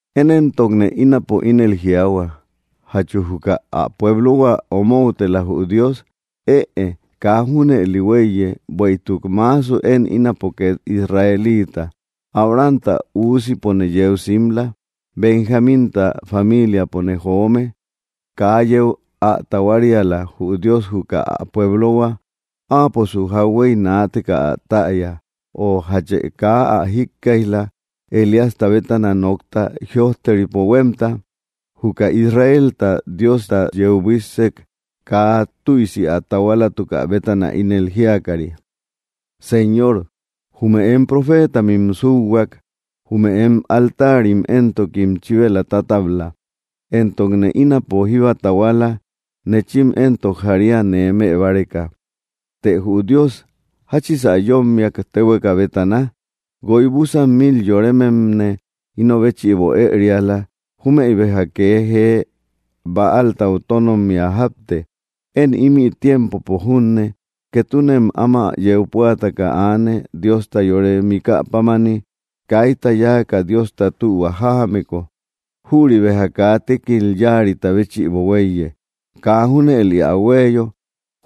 Én éntokne ínapo ínel jiaahua, ¿jachu juka ä pueblohua omoutela, jü Dios? Ëe, kaa junëli huéiye. Bueïtuk maasu én ínapo két Israelita, Abrahamta üusimpone yeu simla, Benjamínta familiapone joome. Kaa yeu ä tahuariala, jü Dios juka ä pueblohua. Áaposu jauhuey naateka ä täya. Ö, ¿jache kaa ä jíkkaijla, Elíasta bétana nokta, jïojteripo huémta? Juka Israelta Diostau yeu buíssek, kaa tüisi ä tahualatukä bétana, ínel jíakari: “Señor, ¡jume em profeetamim súhuak; jume em altarim entokim chíbela tatabla; entokne ínapo jíba tahuala; neechim éntok jaria nee më báreka!” Të jü Dios, ¿jáchisä yómmiak, téhueka bétana? “Guoy búsan mil yorememne íno béchïbo ëeriala; jumeï béja kee jee Bäaltau tónommia jápte.” Én ímï tiempopo junne, ketunem áma yeu púataka aane, Diosta yore mikä pámani. Kaita yáaka Diosta tühua jájameko, jüri béja kaa tékil yáarita béchïbo huéiye. Kaa junëli ä huéeyo,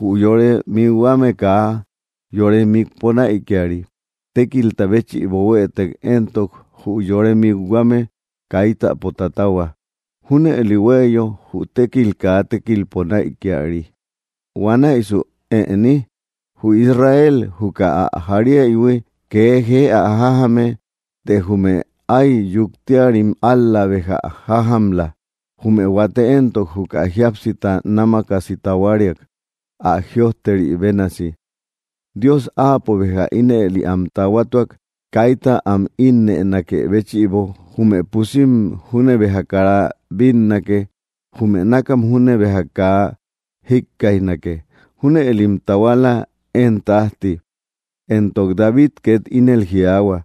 jü yore mikhuame kaa yore mikpo näikiari. Tékilta béchïbo huëtek éntok, jü yore mikhuame kaitapo tatahua. Júnëli huéeyo jü tékkil kaa tékilpo näikiari. Huanäisu, ¿ëni? Jü Israel juka ä jariaïhui, kee jee ä jájame; të jume áy yuktiarim ál‑la béja ä jájamla. Jume huate éntok juka jíapsita námakasi tahuariak. Ä jïojteri bénasi: “Dios Áapo béja ínëli am tahuatuak, kaita am ínnënakë béchïbo. Jume pusim júne béja kara bínnake; jume nákam júne béja kaa jikkaijnake. Júnëlim tahuala, én tájti.” Entok David két ínel jiaahua: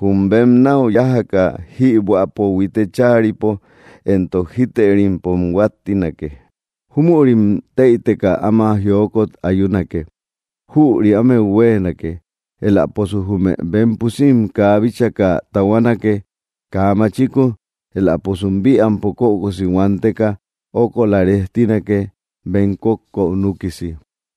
Jum bem náu yájaka jïbuäpo huite cháaripo entok jítërimpom huáttinake. Júmürim tëiteka áma jiokot ayunake. Jüri ámeu huéenake. Eläposu jume bem pusim kaa bíchaka tahuanake, kaa machiku; eläposum bïampo kökosi huanteka ókola rejtinake bem kókkou núkisi.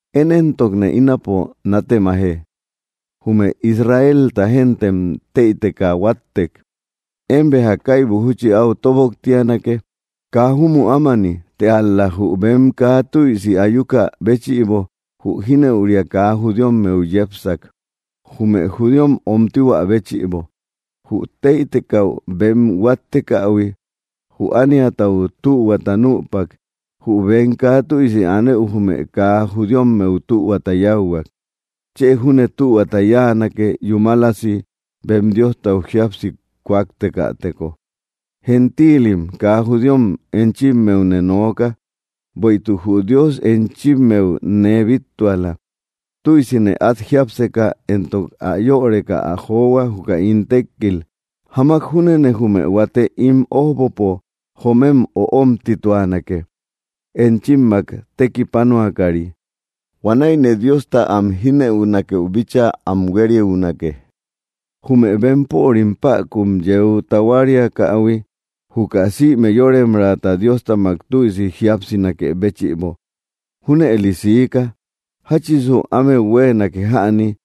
Én éntokne ínapo nátemaje: Jume Israelta gentem, tëiteka huattek; ¿én béja kaibu júchi áu tóboktianake? ¡Kaa júmü ámani! Të ál‑la jü bem kaa tüisi ayuka béchïbo, jü jínëuria kaa judíommeu yepsak, jume judíom öomtituä béchïbo. Jü tëitekäu bem huáttekähui, jü ániatau tühuata nüpak; jü bem kaa tüisi anëu jume kaa judíommeu tühuata yáuhuak. ¡Chë júne tühuata yáanake, yúmalasi bem Diostau jíapsi kúaktekateko! Gentiilim kaa judíom enchimmeune nooka. Bueïtuk jü Dios enchimmeu nee bíttuala. Tüisine át jiápseka entok ä yöreka ä johua, juka ín tékkil. Jamak júnene jume huate ín ójbopo joomem öomtituanake, enchimmak tekipanuakari. Huanäine Diosta am jíneünakeu bíchaa am huériunake. Jume bempörim päkun yeu taahuariakähui juka sïme yoremraata Diostamak tüisi jíapsinakë béchïbo, junëli siika. ¿Jáchisu ámeu huéenake jäni?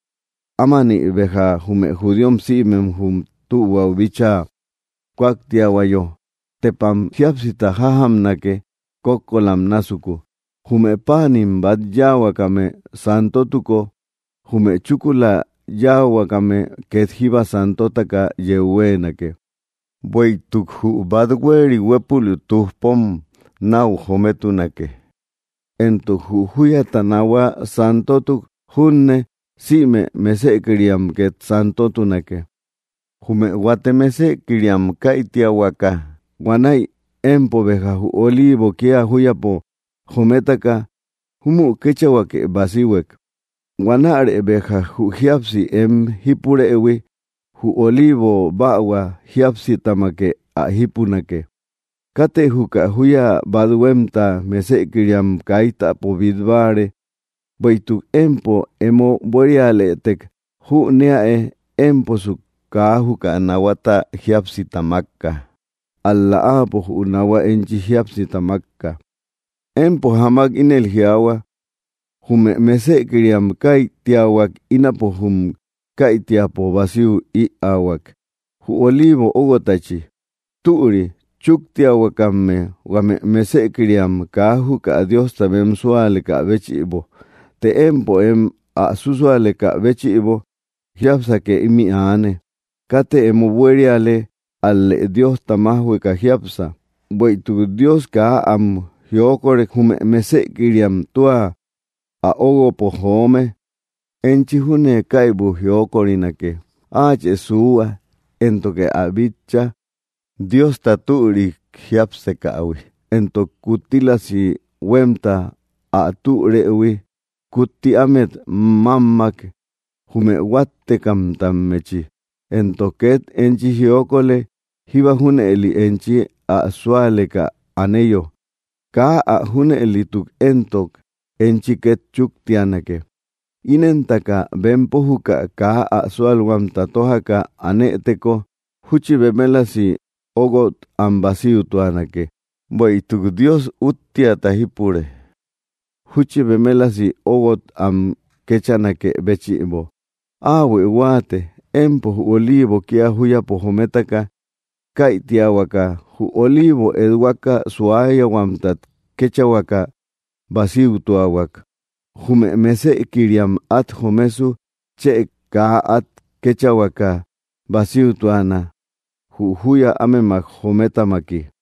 Ámani béja jume judíom sïmem jum tühuau bíchaa kúaktiahuayo, ¡tepam jíapsita jájamnake, kókkolam násuku! Jume páanim bát yáahuakame santotuko, jume chúkula yáahuakame két jíba santotaka yeu huéenake, bueïtuk jü bát huéeri huépul tujpom náu jometunake. Entok jü júyata naahua santotuk junne, sïme mesëkiriam két santotunake. Jume huate mesëkiriam käitiahuakä, huanäi empo béja jü oliivo kía júyapo jometaka, júmü kéchahuake basihuek. Huanärë béja jü jíapsi em jípurëhui jü oliivo bähua jíapsitamake ä jípunake. Katë juka júya bat huémta mesëkiriam kaitapa bít báare; bueïtuk empo emo buérialëtek, jüneäe émposu kaa juka nahuata jíapsita mákka, ál‑la áapo jü nahua enchi jíapsita mákka. Empo jamak ínel jiaahua: “Jume mesëkiriam käitiahuak; ínapo jum käitiapo basiu ïaahuak, jü oliivo óguotachi.” Türi; chúktiahuakamme, huame mesëkiriam, kaa juka Diosta bem súalekä béchïbo. Të empo em ä súsualekä béchïbo jiápsake ímï aane. Katë emo buériale; ál‑lë Diosta májhueka jiápsa. Bueïtuk Dios kaa am jiokorek, jume mesëkiriam tua ä ogúopo joome, enchi júne kaibu jiokorinake. Áachë suuhua, éntokë ä bitcha, Diosta türi jiápsekähui, entok kuttílasi huémta ä türëhui. Kutti ámet mámma, jume huáttekammechi, entok két enchi jiokolë, jíba junëli enchi ä súaleka aneyo. Kaa ä junëlituk éntok, enchi két chúktianake. Inentaka bempo juka kaa ä súalhuamta tójaka anëteko, júchi bemelasi óguot am basiutuanake. Bueïtuk Dios úttiata jípure, júchi bemelasi óuguot am kechanakë béchïbo. Áahuë huáate: Empo jü oliivo kía júyapo jometaka käitiahuaka, jü oliivo ethuaka suayahuamtat kéchahuakä basiutuahuak, ¡jume mesëkiriam át jomesu chë kaa át kéchahuakä basiutuana, jü júya ámemak jometamaki!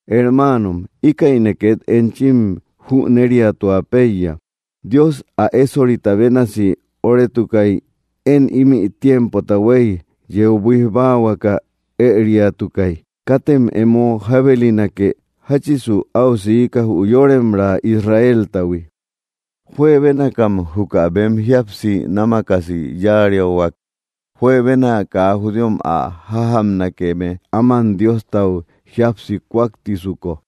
Hermaanom, íkäine két enchim jüneriatua péiya: Dios ä ésorita bénasi óretukay én ímï tiempota huey yeu buíj báahuaka ëriatukay. Katem emo jábelinake. Jáchisu áu siika, jü yoremraa Israeltahui, juebénakam juka bem jíapsi námakasi yáariahuak, juebena kaa judíom ä jajamnakeme aman Diostau jíapsi kuaktisuko,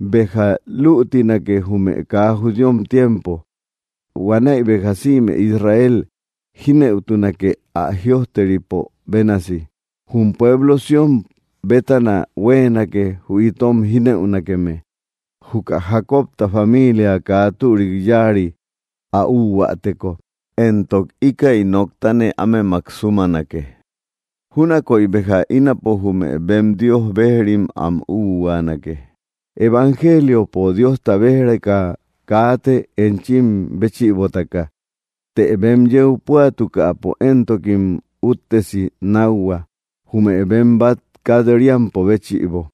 béja lütinake jume kaa judíom tiempo. Huanäi béja sïme Israel jínëutunake, ä jïojteripo bénasi: Jum pueblo Sión bétana huéenake, jü itom jínëunakeme, jukä Jacobta familia kaa türik yáari ä úhuäteko. Entok íkäi noktane ámemak súmanake, júnakoy béja ínapo jume bem Dios bejrim am úhuaanake. Evangeliopo Diosta bej‑reka kaate enchim béchïbotaka, të bem yeu puatukäpo; entokim uttesi nákhua, jume bem bát kat‑riampo béchïbo.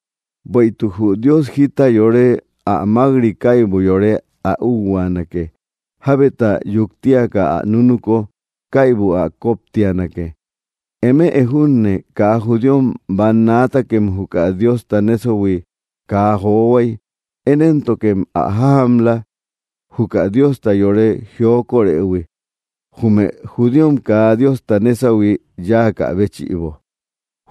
Bueïtuk jü Dios jita yore ä mák‑ri, kaybu yore ä úhuaanake, jabeta yuktiaka ä nunuko kaybu ä koptianake. Eme junne kaa judíom bannaatakem juka Diosta nésahui kaa johuay. Én éntokem ä jajamla, juka Diosta yore jiokorëhui, jume judíom kaa Diosta nésahui yáakä béchïbo.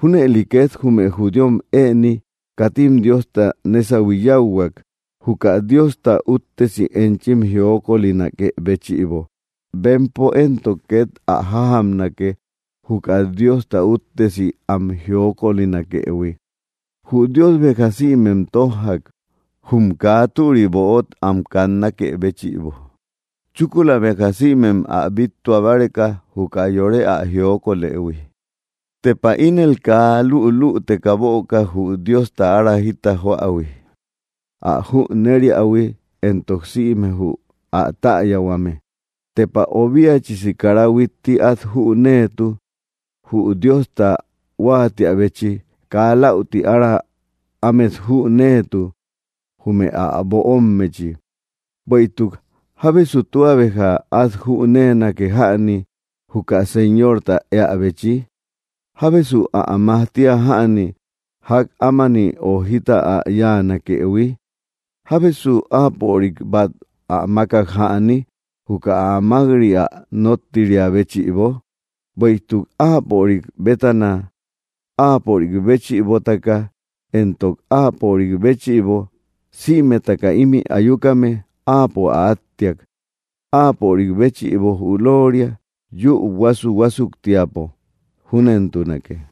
Júnëli két jume judíom ëni katim Diosta nésahui yáuhuak, juka Diosta úttesi enchim jiokolinakë béchïbo. Bempo éntok két ä jájamnake, juka Diosta úttesi am jiokolinakëhui. Jü Dios béja sïmem tójjak, jum kaa türi böot am kannakë béchïbo, chúkula béja sïmem ä bíttua báreka, juka yore ä jiokolëhui. ¡Tepa ínel kaa lülüteka böka, jü Diosta ára jita joähui, ä jüneriähui entok sïme jü täyahuame! Tepa obiachisi kara huitti át jüneetu, jü Diosta huáatiäbechi; kaa läuti ára ámet jüneetu, jume ä böommechi. Bueïtuk, “¿jábesu tua béja át jüneenake jäni, juka Señorta éäbechi? ¿Jábesu ä majtia jäni, ják ámani ö jita ä yáanakëhui? ¿Jábesu Áapörik bát ä mákak jäni, juka ä mák‑ri ä nóttiriä béchïbo?” Bueïtuk Áapörik bétana, Áapörik béchïbotaka, éntok Áapörik béchïbo, sïmetaka ímï ayukame, Áapo ä áttiak. Áapörik béchïbo jü lóoria, yúu huasu‑huasuktiapo. Júnentunake.